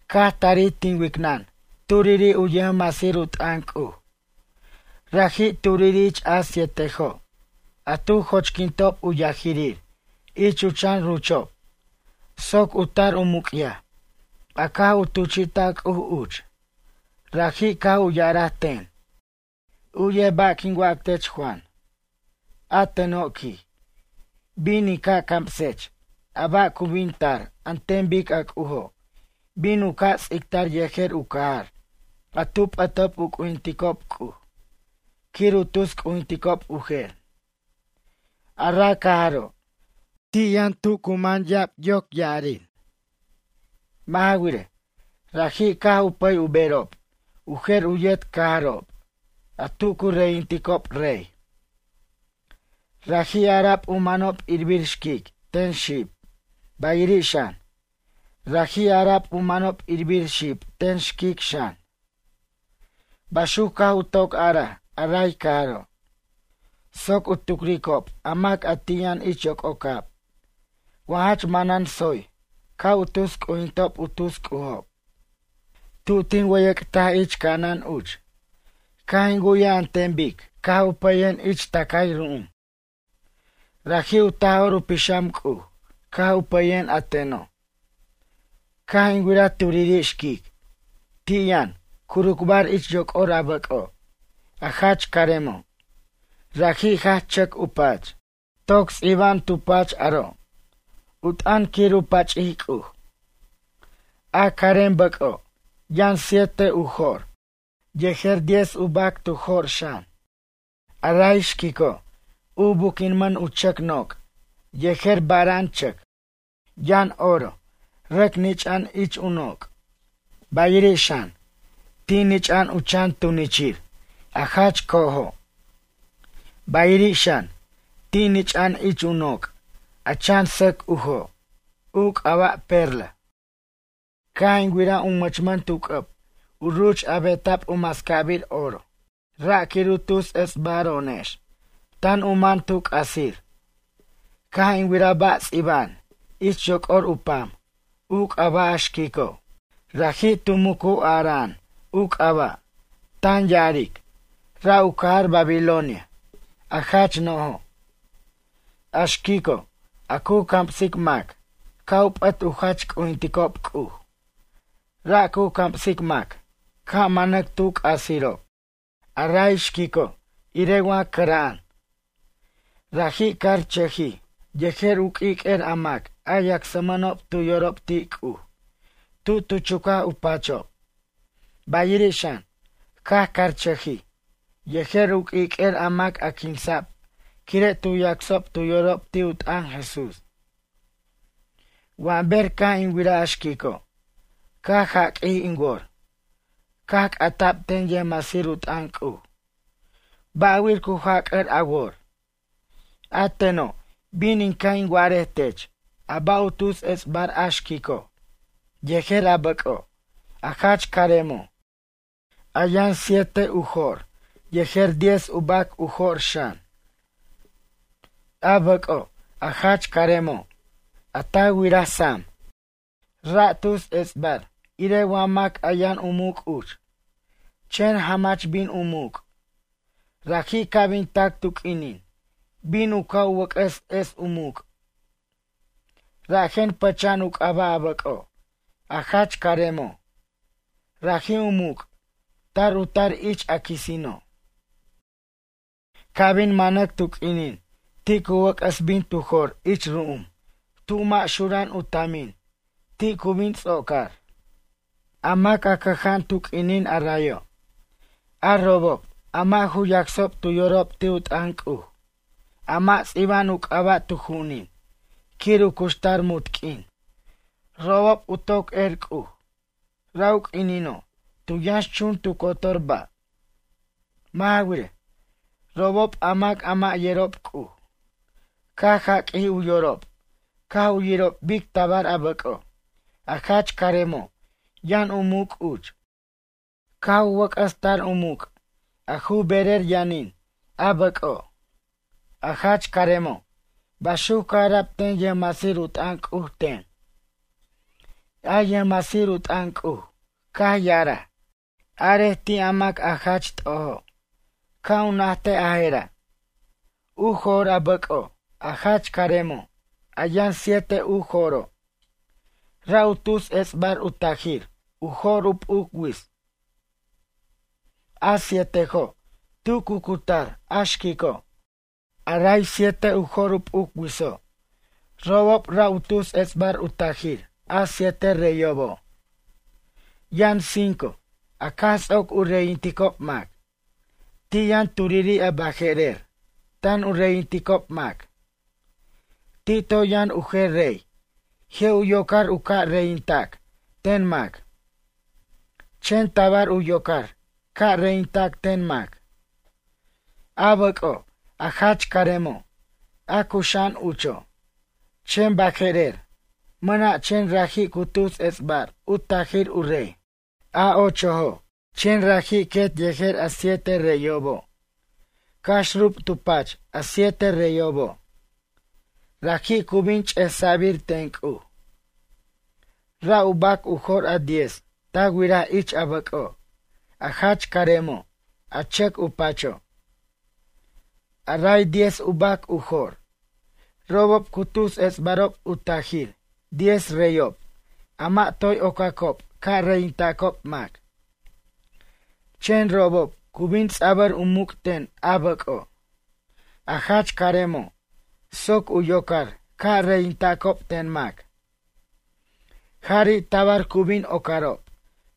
Caj tarij tin wicnʌn turiri' u yʌjmasir u t'ʌn C'uj. Raji' turiri' ich a sietejo', a tu jochquintob u yajirir ich u chan ruchob soc u tar u muc'yaj a caj u tuchi'taj C'uj uch. Raji' caj u ya'araj ten: ―U'yej ba' quin wac tech, Juan. A teno' ―quij―, bin in ca' camsech a ba' cu bin tar an ten bic a C'ujo' bin u ca' ts'ictar yejer u cajar a tu p'ʌtob u c'ujinticob C'uj quir u tus c'ujinticob u jer. A ra' cajaro', ti' yʌn tu yʌn cu man ya'ab yoc ya'arir. Mʌ' ja wirej, raji' caj u pʌy u berob u jer u yet cajarob a tu cu reyinticob rey, raji' ara'b u manob irbir xquic ten xib bayiri' xan, raji' ara'b u manob irbir xib ten xquic xan. Baxuc caj u toc araj a ray cajaro' soc u tucricob a mac a ti' yʌn ich yoc'ocab wa jach manan tsoy ca' u tus c'ujintob u tus c'ujob. Tu tin wʌyʌc'taj ich ca'anan uch, caj in wu'yaj an ten bic caj u pʌyen ich tʌcay ru'um. Raji' u Taj'or u Pixam C'uj caj u pʌyen a teno'. Caj in wiraj turiri' xquic. Ti' yʌn, curucbar ich yoc'or a bʌc'o', a jach caremo'. Raji' jach chʌc u pach. Toc ts'iba'an tu pach aro' u t'ʌn quir u pach'ic C'uj. A carem bʌc'o' yʌn siete u jo'r, yejer diez u bac tu jo'r xan. A ray xquico', u buquinmʌn u chʌc noc' yejer bara'an chʌc. Yʌn oro rʌc nich'a'an ich u noc', bayiri' xan, ti' nich'a'an u chan tunichir, a jach co'ojo'. Bayiri' xan, ti' nich'a'an ich u noc' a chan sʌc ujo', u c'aba' perla. Caj in wiraj u mʌchmʌn tu c'ʌb u ruch a beta'b u mascabir oro, ra' quir u tus ets'baro'onex tan u man tu c'asir. Caj in wiraj ba' ts'iba'an ich yoc'or u pam u c'aba' a xquico'. Raji' tu mucu ara'an u c'aba', tan ya'aric: “Ra' u cajar Babilonia, a jach no'jo'. A xquico', a cu camsic mac ca' u p'ʌt u jach c'ujinticob C'uj. Ra' cu camsic mac ca' manac tu c'asirob.” A ray xquico' irej wa cʌra'an. Rajij carchʌjij yejer u q'uiq'uer a mac a yacsmʌnob tu yorob ti' C'uj tu tu chucaj u pachob. Bayiri' xan, caj carchʌjij yejer u q'uiq'uer a mac a quinsa'b quire' tu yacsob tu yorob ti' u t'ʌn Jesús. Wa ber caj in wiraj a xquico', caj jaq'uij in wor. Caj c'ata'b ten yʌjmasir u t'ʌn C'uj: ―Ba'wir cu jac'ʌr a wor? A teno', bin in ca' in wa'arej tech a ba' u tus ets'bar a xquico', yejer a bʌco', a jach caremo', a yʌn siete u jo'r yejer diez u bac u jo'r xan. A bʌc'o', a jach caremo' a ta wiraj sam, ra' tus ets'bar irej wa mac a yʌn u muc' uch, chen jamach bin u muc'. Raji' ca' bin tac tu q'uinin bin u ca' u wʌc'ʌs es u muc'. Rajen pʌcha'an u c'aba' a bʌco', a jach caremo'. Raji' u muc', tar u tar ich a quisino'. Ca' bin manac tu q'uinin, ti' cu wʌc'ʌs bin tu jor ich ru'um tu mʌ' xura'an u tamin, ti' cu bin ts'ocar. A mac a cʌja'an tu q'uinin a rayo', a robob a mʌ' ju yacsob tu yorob ti' u t'ʌn C'uj, a mʌ' ts'iba'an u c'aba' tu ju'unin quir u cuxtar munt q'uin, robob u toc er C'uj, ra' u q'uinino' tu yʌnxchun tu cotor ba'. Mʌ' ja wirej, robob a mac a mʌ' yerob C'uj, caj jaq'uij u yorob caj u yirob bic tabar a bʌc'o', a jach caremo' yʌn u muc' uch, caj u wʌc'ʌs tar u muc' a ju berer yʌnin a bʌc'o', a jach caremo' ―baxuc caj ara'b ten yʌjmasir u t'ʌn C'uj ten. A yʌjmasir u t'ʌn C'uj caj ya'araj: ―Arej ti' a mac a jach t'ojo', ca' u najtej a je'ra'. U jo'r a bʌc'o', a jach caremo', a yʌn siete u jo'ro', ra' u tus ets'bar u tajir u jor u p'uc wits, a sietojo' tu cu cutar a xquico'. A ray siete u jor u p'uc witso', robob ra' u tus ets'bar u tajir a siete reyobo'. Yʌn cinco a caj ts'oc u reyinticob mac. Ti' yʌn turiri' a baje'rer tan u reyinticob mac. Ti' toy yʌn u jer rey je' u yocar u ca' reyintac ten mac, chen tabar u yocar ca' reyintac ten mac. A bʌc'o', a jach caremo', a cuxa'an ucho' chen baje'rer mʌna' chen raji' cu tus ets'bar u tajir u rey, a ochojo', chen raji' quet yejer a siete reyobo' cax rub tu pach a siete reyobo'. Raji' cu bin ch'esa'bir ten C'uj. ’Ra' u bac u jo'r a diez ta wiraj ich a bʌc'o', a jach caremo' a chʌc u pacho'. A ray diez u bac u jo'r, robob cu tus ets'barob u tajir diez reyob a mʌ' toy ocacob ca' reyintacob mac, chen robob cu bin ts'abʌr u muc' ten a bʌc'o', a jach caremo', soc u yocar ca' reyintacob ten mac. Jari' tabar cu bin ocarob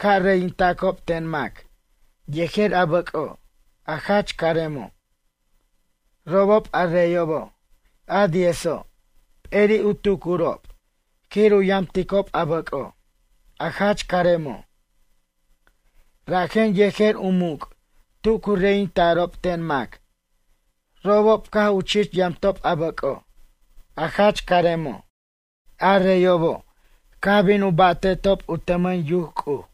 ca' reyintacob ten mac yejer a bʌc'o', a jach caremo'. Robob a reyobo', a diezo', p'eri' u tucurob quir u yamticob a bʌc'o', a jach caremo'. Rajen yejer u muc' tu cu reyinta'rob ten mac robob caj u chich yamtob a bʌc'o', a jach caremo'. A reyobo', caj bin u ba'te'tob u tʌmʌn yuc C'uj,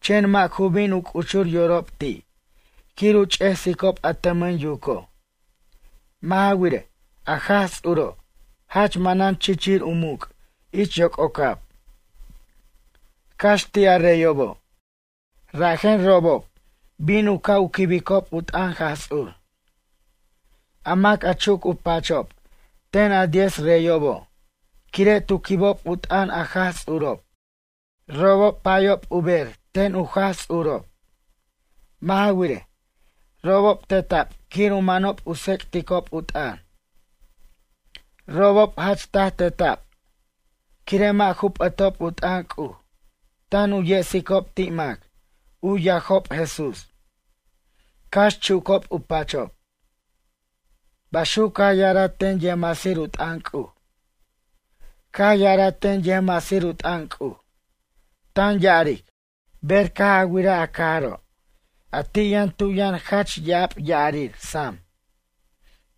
chen mʌ' ju bin u c'uchur yorob ti', quir u ch'esicob a tʌmʌn yuco'. Mʌ' ja wirej, a Jaj Ts'uro' jach manan chichir u muc' ich yoc'ocab, cax ti' a reyobo', rajen robob bin u ca' u quibicob u t'ʌn Jaj Ts'ur. A mac a chuc u pachob ten a diez reyobo' quire' tu quibob u t'ʌn a Jaj Ts'urob. Robob payob u ber ten u Jaj Ts'urob. Mʌ' ja wirej, robob teta'b quir u manob u tsec'ticob u t'ʌn. Robob jach taj teta'b quire' mʌ' ju p'ʌtob u t'ʌn C'uj tan u yesicob ti' mac u yajob Jesús, cax chucob u pachob. ―baxuc caj ya'araj ten yʌjmasir u t'ʌn C'uj. Caj ya'araj ten yʌjmasir u t'ʌn C'uj, tan ya'aric: ―Ber caj a wiraj a cajaro' a ti' yʌn tu yʌn jach ya'ab ya'arir sam,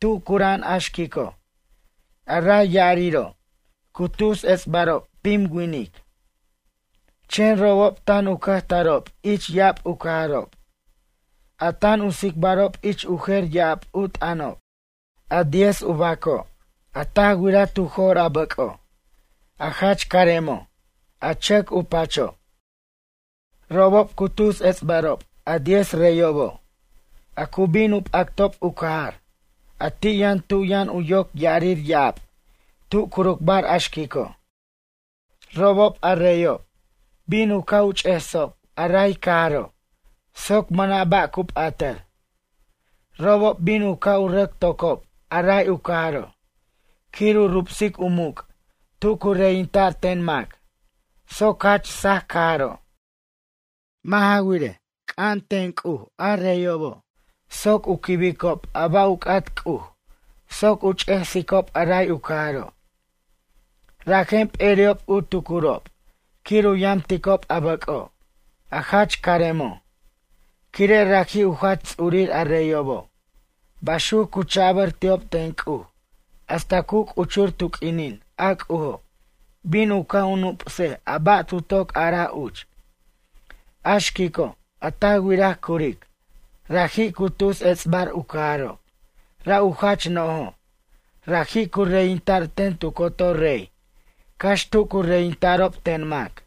tu cura'an a xquico', a ray ya'ariro' cu tus ets'barob pim winic, chen robob tan u cʌjtarob ich ya'ab u cajarob, a tan u tsicbarob ich u jer ya'ab u t'ʌnob. A diez u baco' a ta wiraj tu jo'r a bʌc'o', a jach caremo', a chʌc u pacho', robob cu tus ets'barob a diez reyobo', a cu bin u p'actob u cajar, a ti' yʌn tu yʌn u yoc ya'arir ya'ab, tu curucbar a xquico'. Robob a reyob bin u ca' u ch'esob a ray cajaro', soc mʌna' ba' cu p'atʌr. Robob bin u ca' u rʌc tocob a ray u cajaro' quir u rubsic u muc' tu cu reyinta'r ten mac soc jach saj cajaro'. Mʌ' ja wirej, c'an ten C'uj a reyobo', soc u quibicob a ba' u c'at C'uj soc u ch'esicob a ray u cajaro'. Rajen peri'ob u tucurob quir u yamticob a bʌc'o' a jach caremo', quire' raji' u jach ts'urir a reyobo'. Baxuc cu cha'bʌr ti'ob ten C'uj hasta cu c'uchur tu q'uinin a C'ujo' bin u ca' u nup'sej a ba' tu toc araj uch. A xquico' a ta wiraj curic, raji' cu tus ets'bar u cajaro' ra' u jach no'jo', raji' cu reyinta'r ten tu cotor rey cax tu cu reyinta'rob ten mac.